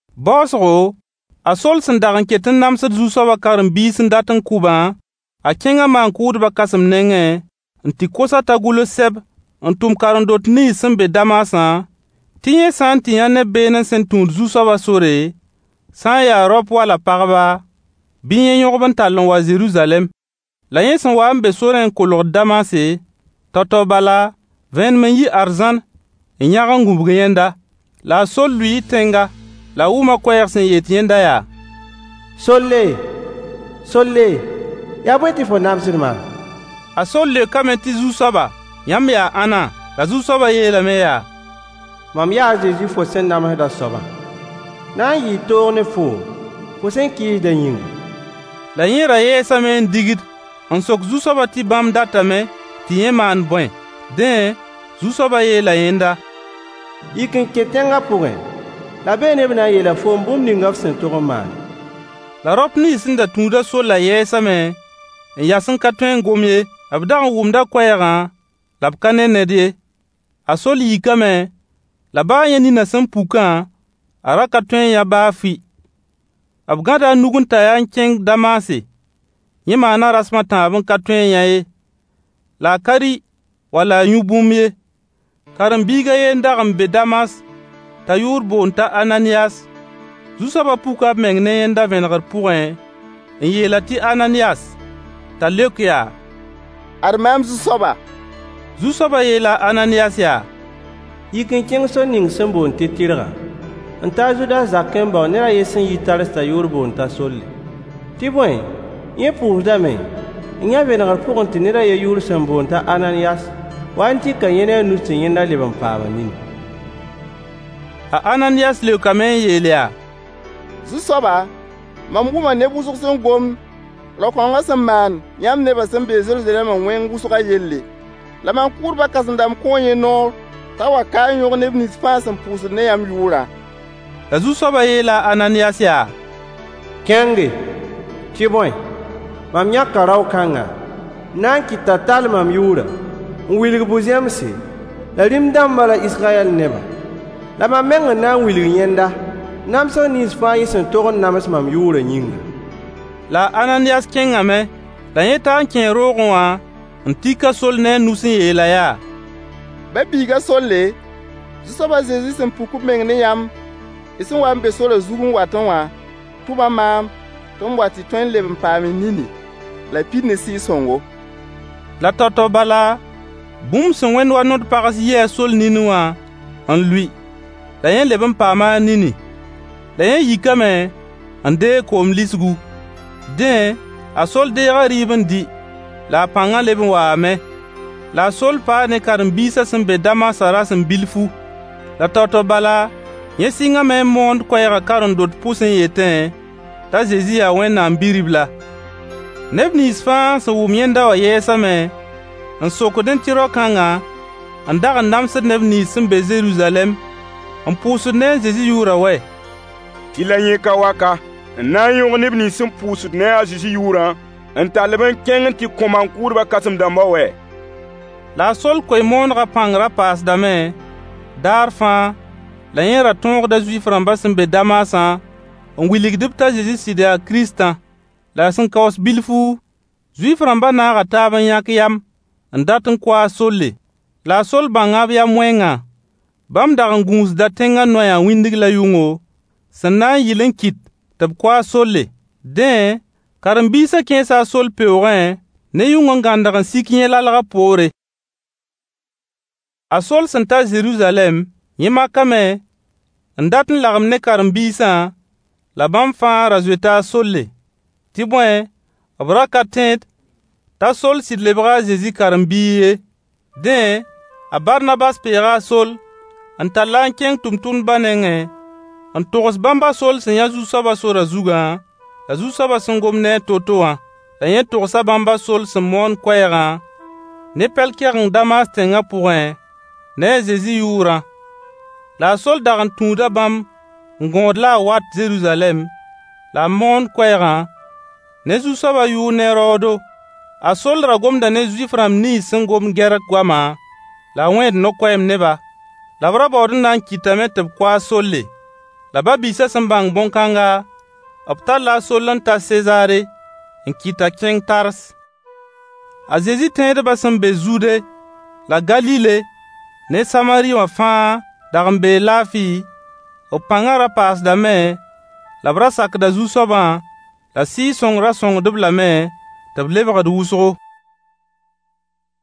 Baoosgo, a Soll sẽn dag n ket n namsd Zu-soaba karen-biis n dat kʋ-bã, a kẽnga maan-kʋʋdba kãsem nengẽ n tɩ kos-a t'a gʋls sɛb n tʋm karen-dot nins sẽn be Damasã tɩ yẽ sã tɩ n yã neb beene sẽn tũud Zu-soaba sore, sã n ya raop wala pagba, bɩ yẽ yõg-b n tall n wa Zeruzalɛm. La yẽ sẽn wa n be sorẽ n kolg Damase, tao-tao bala, vẽenem n yi arzãn n yãg n gũbg yẽnda. La a Soll lʋɩɩ tẽnga. La a wʋma koɛɛg sẽn yet yẽnda yaa: Solle, Solle, yaa bõe tɩ fo namsd maam? A Soll leokame tɩ Zu-soaba, yãmb yaa ãnna: La Zu-soaba yeelame yaa: Mam yaa a Zezi fo sẽn namsd a soabã. [Na n yɩɩ toog ne foom, fo sẽn kɩɩsda yĩnga. La yẽ ra yɛɛsame n digd n sok Zu-soaba tɩ bãmb datame tɩ yẽ maan bõe. Dẽ Zu-soaba yeela yẽnda.] Yik n kẽ tẽngã pʋgẽ, la beene b na n yeela foom bũmb ninga f sẽn tog n maane. La raop nins sẽn da tũud a Sollã yɛɛsame n yas n ka tõe n gom ye. B dag n wʋmda koɛɛgã la b ka ne ned ye. A Soll yikame, la baa yẽ nina sẽn pukã, a ra ka tõe n yã baa fʋɩ. B gãda a nug n tae-a n kẽng Damase. Yẽ maana rasem a tãab n ka tõe n yã ye. La a ka rɩ wala a yũ bũmb ye. Karen-biig a ye n dag n be Damas t'a yʋʋr boond t'a Ananiyas. Zu-soaba puka b meng ne yẽnda vẽnegr pʋgẽ n yeel-a tɩ Ananiyas! T'a leok yaa: Ad mam Zu-soaba. Zu-soaba yeela a Ananiyas yaa: Yik n kẽng sor ning sẽn boond tɩ tɩrgã n ta a Zudas zakẽ n bao ned yen sẽn yit Tars t'a yʋʋr boond t'a Solle. Tɩ bõe yẽ pʋʋsdame n yã vẽnegr pʋgẽ tɩ ned a yen yʋʋr sẽn boond t'a Ananiyas waa n tik yẽ ne a a nus tɩ yẽnda leb n paam a nini. A Ananiyas leokame n yeel yaa: Zu-soaba, mam wʋma neb wʋsg sẽn gomd rao-kãnga sẽn maan yãmb nebã sẽn be Zeruzalɛma wẽng wʋsga yelle. La maan-kʋʋdba kãsem-dãmb kõo yẽ noor t'a wa ka n yõg neb nins fãa sẽn pʋʋsd ne yãmb yʋʋrã. La Zu-soab yeela a Ananiyas yaa: Kẽnge. Tɩ bõe, mam yãka rao-kãnga n na n kɩt t'a tall mam yʋʋrã n wilg bu-zẽmse la rĩm-dãmba la Israyɛl nebã. La mam meng n na n wilg yẽnda namsg nins fãa yẽ sẽn tog n nams yʋʋrã yĩngã. La a Ananiyas kẽngame. La yẽ taa n kẽe roogẽ wã n tik a Soll ne a nus n yeel-a yaa: Ba-biig a Solle, Zu-soab a Zezi sẽn puk b meng ne yãmb y sẽn wa n be sorã zug n watẽ wã tʋma maan tɩ m wa tɩ y tõe n leb n paam y nini, la y pid ne Sɩɩg-sõngo. La tao-tao bala, bũmb sẽn wẽnd wa nod-pags yi a Soll nini wã n lʋɩ. La yẽ leb n paama a nini. La yẽ yikame n deeg koom lisgu. Dẽ, a Soll deega rɩɩb n dɩ la a pãnga leb n waame. La a Soll paa ne karen-biisã sẽn be Damasã rasem bilfu. La tao-tao bala, yẽ sɩngame n moond koɛɛga karen-dot pʋs n yẽte t'a Zezi yaa Wẽnnaam Bi-ribla. Neb nins fãa sẽn wʋm yẽnda wã yɛɛsame n sokdẽ tɩ rao-kãnga n dag n namsd neb nins sẽn be Zeruzalɛm n pʋʋsd ne a Zezi yʋʋra wɛ! Tɩ la yẽ ka wa ka n na n yõg neb nins sẽn pʋʋsd ne a Zezi yʋʋrã n tall-b n kẽng n tɩ ko maan-kʋʋdba kãsem-dãmba wɛ? La a Soll koe-moonegã pãng ra paasdame daar fãa la yẽ ra tõogda Zuif-rãmbã sẽn be Damasã n wilgd-b t'a Zezi sɩd yaa Kiristã. La sẽn kaoos bilfu, Zuif-rãmba naaga taab n yãk yam n dat n kʋ a Solle. La a Soll bãnga b yam-wẽngã. Bãmb dag n gũusda tẽnga noyã wĩndg la yʋngo, sẽn na n yɩl n kɩt tɩ b kʋ a Solle. Dẽ, karen-biisa kẽesa a Soll peoogẽ ne yʋng n gãndg n sik yẽ lalgã poore. A Soll sẽn ta Zeruzalɛm, yẽ makame n dat n lagem ne karen-biisã, la bãmb fãa ra zoeta a Solle. Tɩ bõe, b ra ka tẽed t'a Soll sɩd lebga a Zezi karen-biig ye. Dẽ, a Barnabas peega a Soll n tall-a n kẽng tʋmtʋmdba nengẽ, n togs bãmb a Soll sẽn yã Zu-soaba sorã zugã, la Zu-soaba sẽn gom ne-a to-to wã. La yẽ togsa bãmb a Soll sẽn moon koɛɛgã ne pɛl-kɛgeng Damas tẽngã pʋgẽ ne a Zezi yʋʋrã. La a Soll dag n tũuda bãmb n gõod la a wat Zeruzalɛm la a moond koɛɛga ne Zu-soaba yʋʋr ne raoodo. A Soll ra gomda ne Zuif-rãmb nins sẽn gomd Gɛrk goama la a wẽed no-koɛɛm ne-ba. La b ra baood n na n kɩtame tɩ b kʋ a Solle. La ba-biisã sẽn bãng bõn-kãnga, b talla a Soll n ta Sezaare n kɩt t'a kẽng Tars: A Zezi tẽedba sẽn be zuude la Galile ne Samari wã fãa dag n bee laafɩ, b pãnga ra paasdame la b ra sakda Zu-soabã la Sɩɩg-sõng ra sõngd-b lame tɩ b lebgd wʋsgo.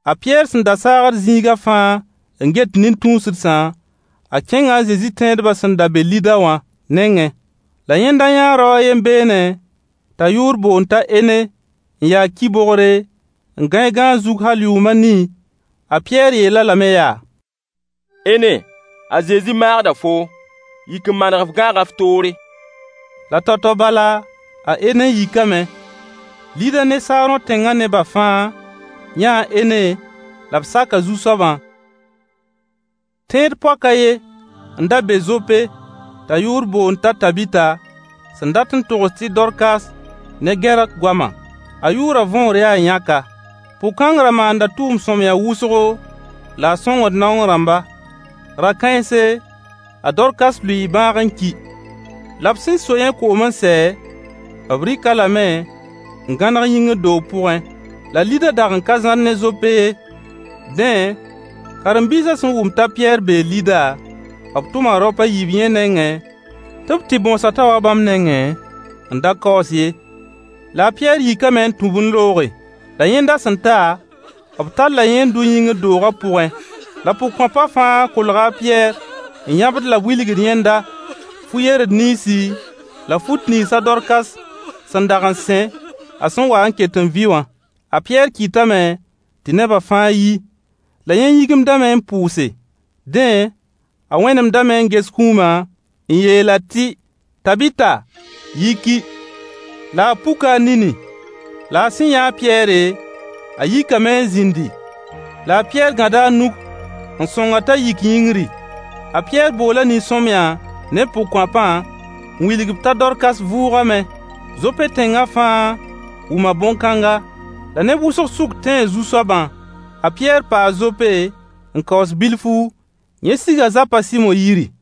A Pɩyɛɛr sẽn da saagd zĩiga fãa n get nin-tũusdsã, a kẽnga a Zezi tẽedba sẽn da be lida wã nengẽ. La yẽnda yaa rao a yen beene t'a yʋʋr boond t'a Ene n ya ki-bogre n gãe gãag zug hal yʋʋm a nii. A Pɩyɛɛr yeel-a lame yaa: Ene, a Zezi maagda foo, yik n maneg f gãagã f toore. La tao-tao bala a Ene yikame Lida ne Saarõ tẽnga neba fãa yãa a Ene la b saka Zu-soabã. Tẽed-poak a ye n da be Zope t'a yʋʋr boond t'a Tabita sẽn dat n togs tɩ Dorkas ne Gɛrk goama. A yʋʋra võor yaa yãka: Pʋg-kãng ra maanda tʋʋm-sõamyã wʋsgo, la a sõngd naong rãmba. Ra-kãense, a Dorkas lʋɩɩ bãag n ki. La b sẽn so yẽ koom n sɛ, b rɩk-a lame n gãneg yĩngr doog pʋgẽ. La Lida dag n ka zãr ne Zope ye. Dẽ, karen-biisã sẽn wʋm t'a Pɩyɛɛr bee Lida, b tʋma raop a yiib ye nengẽ tɩ b tɩ bõos-a t'a wa bãmb nengẽ n da kaoos ye. La a Pɩyɛɛr yikame n tũ-b n looge. La yẽnda sẽn ta, b talla yẽ n dʋ yĩngr dooga pʋgẽ. La pʋgkõapa fãa kolga a Pɩyɛɛr n yãbd la b wilgd yẽndã fu-yerd ninsi la fut nins a Dorkas sẽn dag n sẽ a sẽn wa n ket n vɩ wã. A Pɩyɛɛr kɩtame tɩ neba fãa yi. La yẽ yĩgimdame n pʋʋse. Dẽ a wẽnemdame n ges kũuma n yeel-a tɩ Tabita yiki. La a puka a nini. La a sẽn yãa a Pɩyɛɛr, a yikame n zĩndi. La a Pɩyɛɛr gãda a nug n sõng-a t'a yik yĩngri. A Pɩyɛɛr boola nin-sõamyã ne pʋgkõapã n wilg-b t'a Dorkas vʋʋgame. Zope tẽnga fãa wʋma bõn-kãnga, la neb wʋsg suk tẽe Zu-soabã. A Pɩyɛɛr paa Zope n kaoos bilfu, yẽ siga zapa a Sɩmo yiri.